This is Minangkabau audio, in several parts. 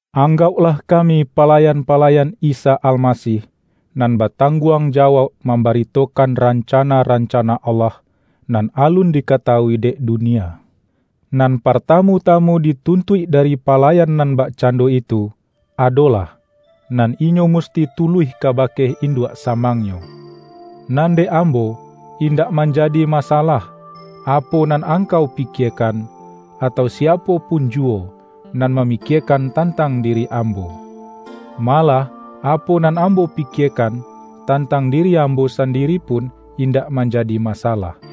Anggauklah kami palayan-pala-yan Isa Almasih, nan batangguang jawauk mambaritokan rancana-ranca-na Allah, nan alun dikatawui dek du-nia. Nan partamu-tamu dituntuik da-ri palayan nan bakcando itu, adolah, nan inyo musti tuluih kabake induak samangnyo. Nan dek ambo, indak manjadi masalah, apo nan angkau pi-kiekan - atau siapo pun juwo, - nan mamikiekan tantang diri ambo. Ma-lah apo nan ambo pikiekan, tantang diri ambo sandiri pun indak manjadi masalah.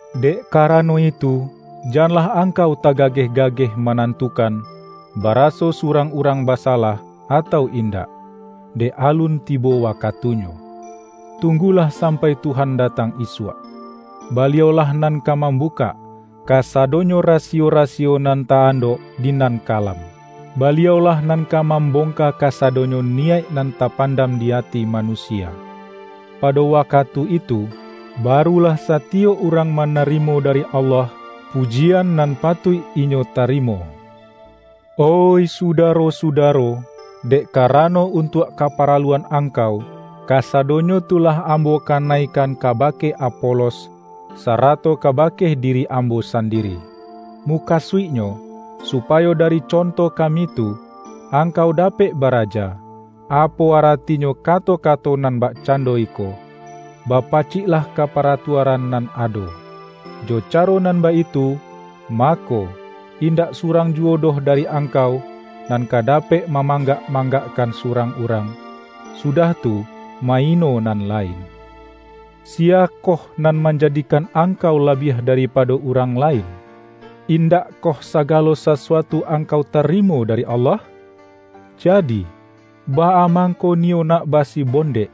Dek karano itu, janlah angkau tagageh-gageh manantukan, baraso surang urang basalah atau in-dak, dek alun tibo wakatunyo. Tung-gulah sampai Tuhan datang isuak. Ba-liau-lah nan ka mambukak, kasadonyo rasiyo-rasiyo nan ta-andok di nan ka-lam. Baliau-lah nan ka mambongka ka-sadonyo niyaik nan tapandam di ati manusia. Pado wakatu itu, barulah sa-tiyok urang manarimo dari Allah, pu-jian nan patuik inyo tarimo. Oih sudaro-sudaro! Dek karano un-tuak kaparaluan angkau, kasadonyo tu lah ambo kanaikan kabake Apolos, sarato kabake diri ambo sandiri. Mu-kasuiknyo supayo dari conto kami tu, angkau dapek baraja, apo aratinyo ka-to-kato nan bakcando iko,”Bapacik-lah ka paratuaran nan ado.” Jo caro nan baitu, mako, indak surang juwo doh dari angkau, nan ka dapek ma-manggak-manggakkan surang urang, sudah tu, ma-ino nan lain. Siyakoh nan manjadikan angkau labiah dari-pado urang lain? Indakkoh sagalo sa-suatu angkau tarimo dari Allah? Ja-di, baa mangko niyo nak basibondek,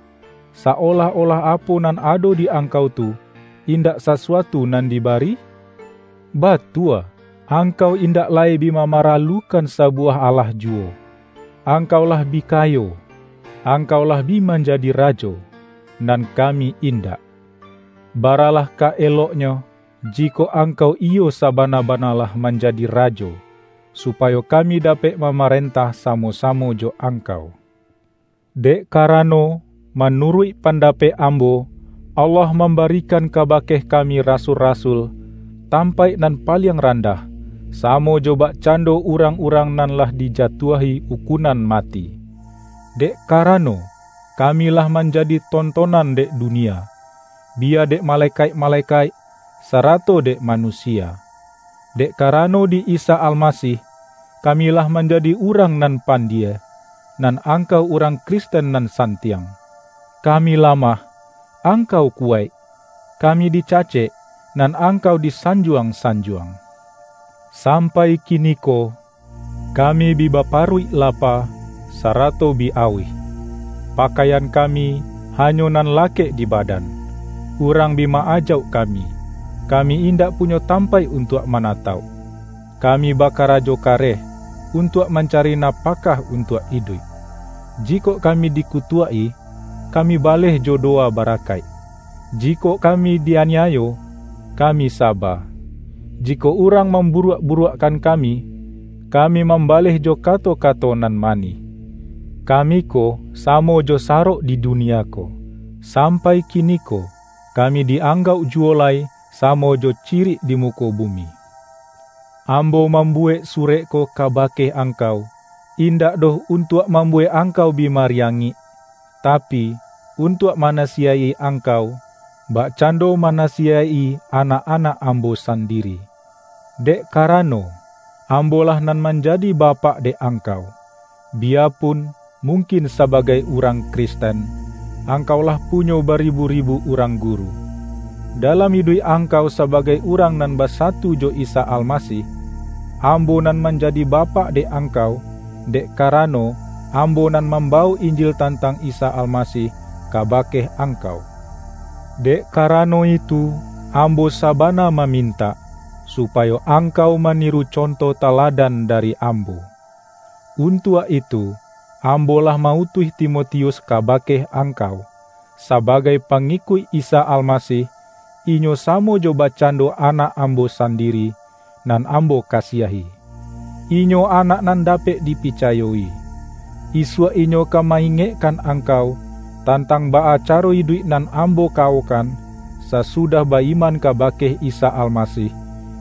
sa-olah-olah apo nan ado di angkau tu, indak sasuatu nan dibari? Batua, angkau indak lai bi mamaralukan sa-buwah alah juwo! Angkau lah bi ka-yo! Angkau lah bi manjadi rajo! Nan kami indak. Baralah ka eloknyo, jikok angkau iyo sabana-bana lah manjadi rajo, supayo kami dapek mamaren-tah samo-samo jo angkau. Dek kara-no, manuruik pandapek ambo, Allah mambarikan kabake kami rasul-ra-sul, tampaik nan paliang randah, sa-mo jo bakcando urang-urang nan lah dijatuahi ukunan mati, dek karano, kami lah manjadi tontonan dek du-nia, biya dek malekaik-malekaik, sa-rato dek manusia. Dek karano di Isa Almasih, kami lah manjadi urang nan pandie, nan angkau urang Kris-ten nan santiang! Kami lamah, ang-kau kuwaik! Kami dicacek, nan ang-kau disanjuang-sanjuang! Sampai kiniko, kami bi baparuik lapa, sarato bi auih; pakaian kami, hanyo nan la-kek di badan; urang bi ma-ajauk ka-mi; kami indak punyo tampaik untuak manatauk; kami bakarajo kareh, un-tuak mancari napakah untuak iduik. Jikok kami dikutuak-i, kami baleh jo dowa barakaik; jikok kami di-aniayo, kami saba; jikok urang mamburuak-buruakkan kami, kami mambaleh jo kato-kato nan manih. Kami ko samo jo sarok di dunia ko; sampai kiniko, kami di-anggauk juwo lai samo jo ci-rik di muko bumi. Ambo mambuwek surek ko kabake angkau, indak doh untuak mambuwek angkau bi mariangik, tapi, untuak ma-nasiyaik-i angkau, bakcando manasi-yaik-i anak-anak ambo sandiri. Dek karano, ambolah nan manjadi bapak dek angkau, biyapun, mungkin saba-gai urang Kristen, angkau lah punyo baribu-ribu urang guru. Dalam iduik angkau sabagai urang nan basatu jo Isa Almasih, ambo nan manjadi bapak dek angkau, dek karano, ambo nan mambawok Injil tantang Isa Almasih kabake angkau. Dek karano itu, am-bo sabana mamintak, supayo angkau maniru conto taladan dari ambo. Un-tuak itu, ambo lah ma-utuih Timotius kabake angkau. Sabagai pangikuik Isa Almasih, inyo samo jo bakcando anak ambo sandiri, nan ambo kasiahi. Inyo anak nan dapek dipicayo-i. Isuak inyo ka ma-ingekkan angkau, tantang baa caro iduik nan ambo kawokan, sasu-dah ba-iman kabake Isa Almasih,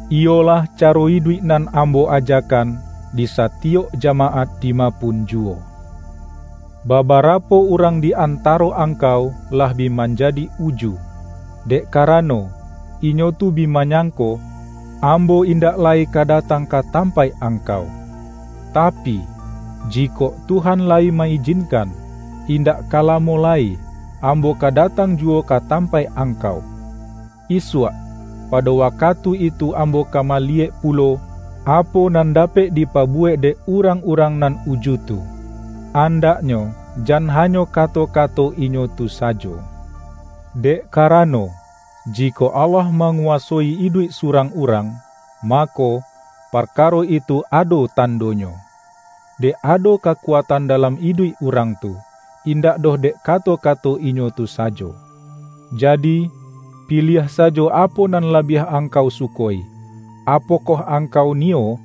iyo-lah caro iduik nan ambo ajakan, di sa-tiyok jamaat dima pun juwo. Babarapo urang di antaro ang-kau, lah bi manjadi uju, dek karano, inyo tu bi manyangko, ambo indak lai ka datang ka tampaik angkau. Ta-pi, jikok Tuhan layi ma-ijinkan, indak ka lamo lai, ambo ka datang juwo ka tampaik angkau. Isuak, pado wakatu itu ambo ka maliyek pulo, apo nan da-pek dipabuwek dek urang-urang nan uju tu; andaknyo jan hanyo kato-ka-to inyo tu sajo. Dek karano, jikok Allah manguwasoi iduik surang urang, mako, parkaro itu ado tandonyo, dek ado kakuatan dalam iduik urang tu, indak doh dek kato-kato inyo tu sa-jo. Jadi, piliah sajo apo nan labiah angkau suko-i! Apokoh angkau niyo,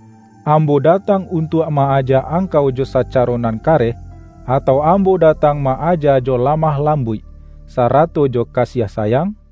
ambo datang untuak ma-aja angkau jo sacaro nan kareh, atau ambo da-tang ma-aja jo lamah lambuik, sara-to jo kasiah sayang?